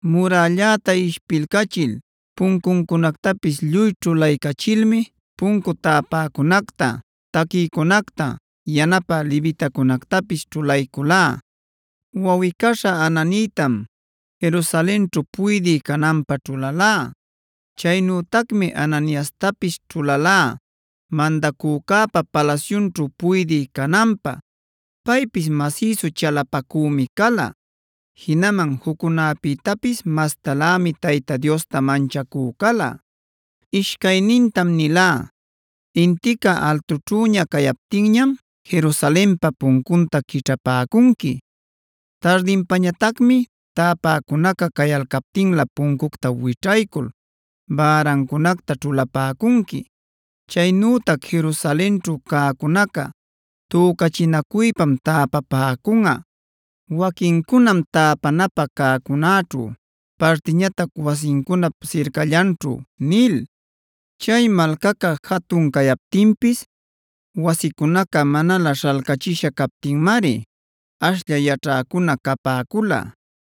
Muralläta ishpilcachil puncuncunactapis lluy ćhulaycachilmi puncu täpäcunacta, taquïcunacta, yanapä levitacunactapis ćhulayculá. Wawꞌicaśhá Hananïtama Jerusalenćhu puydï cananpä ćhulalá. Chaynütacmi Hananiastapis ćhulalá mandacücäpa palasyunćhu puydï cananpä. Paypis masïsu chalapacümi cala; jinaman juccunäpïtapis mastalämi Tayta Diosta manchacü cala. Ishcaynintam nilá: “Intica altućhüña cayaptinñam Jerusalenpa puncunta quićhapäcunqui. Tardinpañatacmi täpäcunaca cayalcaptinlä puncucta wićhaycul bärancunacta ćhulapäcunqui. Chaynütac Jerusalenćhu cäcunaca tücachinacuypam täpapäcunꞌa: waquincunam täpanapä cäcunäćhu, partiñatac wasincunap sircallanćhu” nil. Chay malcaca jatun cayaptinpis wasicunaca manalä śhalcachisha captinmari ashlla yaćhäcuna capäcula.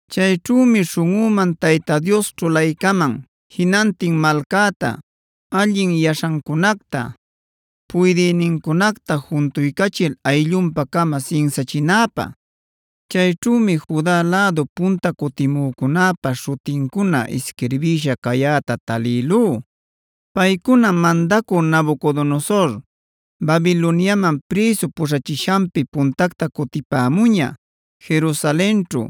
Chayćhümi śhunꞌüman Tayta Dios ćhulaycaman jinantin malcäta, allin yaśhancunacta, puydïnincunacta juntuycachil ayllunpa-cama sinsachinäpä. Chayćhümi Juda lädu punta cutimücunäpa śhutincuna isquirbïsha cayäta talïlú. Paycunam mandacü Nabucodonosor Babiloniaman prïsu puśhachishanpi puntacta cutipämuña, Jerusalenćhu,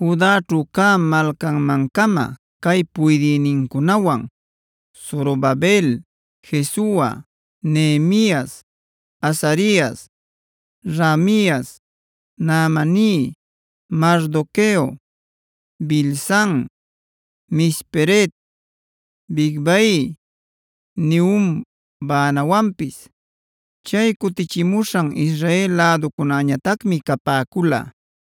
Judaćhu cä malcanman-cama cay puydïnincunawan: Zorobabel, Jesua, Nehemias, Azarias, Raamias, Nahamani, Mardoqueo, Bilsan, Misperet, Bigvai, Nehum, Baanawanpis. Chay cutichimuśhan Israel läducunäñatacmi capäcula: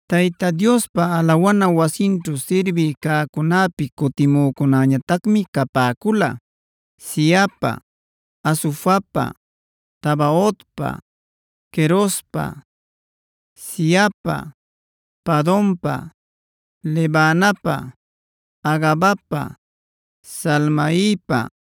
Tayta Diospa alawana wasinćhu sirbï cäcunäpi cutimücunäñatacmi capäcula: Zihapa, Hasufapa, Tabaotpa, Querospa, Siahapa, Padonpa, Lebanapa, Hagabapa Salmaipa,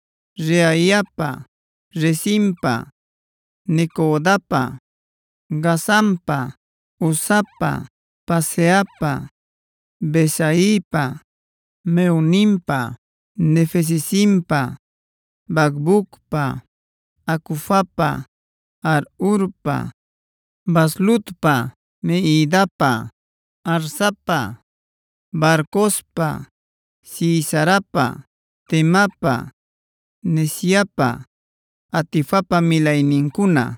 Reaiapa, Rezinpa, Necodapa, Gazampa, Uzapa, Paseahpa, Besaipa, Mehunimpa, Nefisesimpa, Bacbucpa, Hacufapa, Harhurpa, Bazlutpa, Mehidapa, Harsapa, Barcospa, Sisarapa, Temapa, Neziapa, Hatifapa milaynincuna.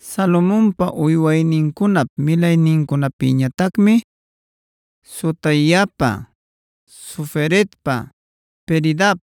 Salomonpa uywaynincunap milaynincunapïñatacmi: Sotaipa, Soferetpa, Peridap,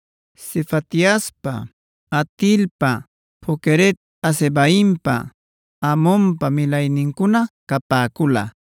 Sefatiaspa, Hatilpa, Poqueret-hazebaimpa, Amonpa milaynincuna capäcula.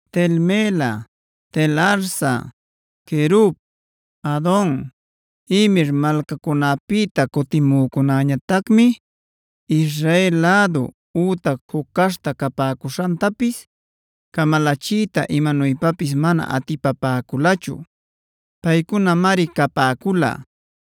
Tel-mela, Tel-harsa, Querub, Adon, Imer malcacunapïta cutimücunäñatacmi Israel lädu ütac juc caśhta capäcuśhantapis camalachiyta imanuypapis mana atipapäculachu. Paycunamari capäcula: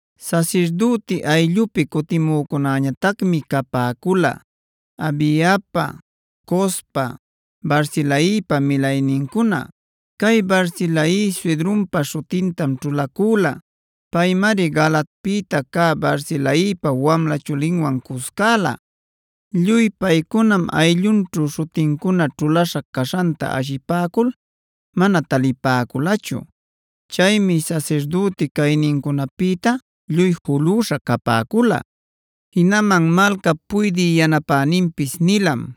Sasirdüti ayllupi cutimücunäñatacmi capäcula: Habaiapa, Cospa, Barzilaipa milaynincuna. Cay Barzilai suydrunpa śhutintam ćhulacüla. Paymari Galaadpïta cä Barzilaipa wamla chulinwan cuscäla. Lluy paycunam ayllunćhu śhutincuna ćhulaśha caśhanta ashipäcul mana talipäculachu. Chaymi sasirdüti caynincunapïta lluy julüśha capäcula. Jinaman malcap puydï yanapäninpis nilam: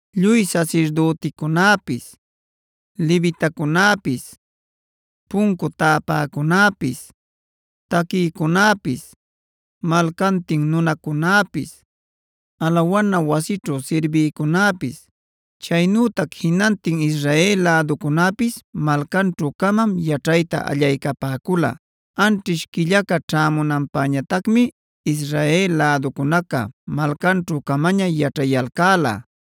Lluy sasirdüticunäpis, levitacunäpis, puncu täpäcunäpis, taquïcunäpis, malcantin nunacunäpis, alawana wasićhu sirbïcunäpis, chaynütac jinantin Israel läducunäpis malcanćhu-camam yaćhayta allaycapäcula.c Anćhish quillaca ćhämunanpäñatacmi Israel läducunaca malcanćhu-camaña yaćhayalcäla.d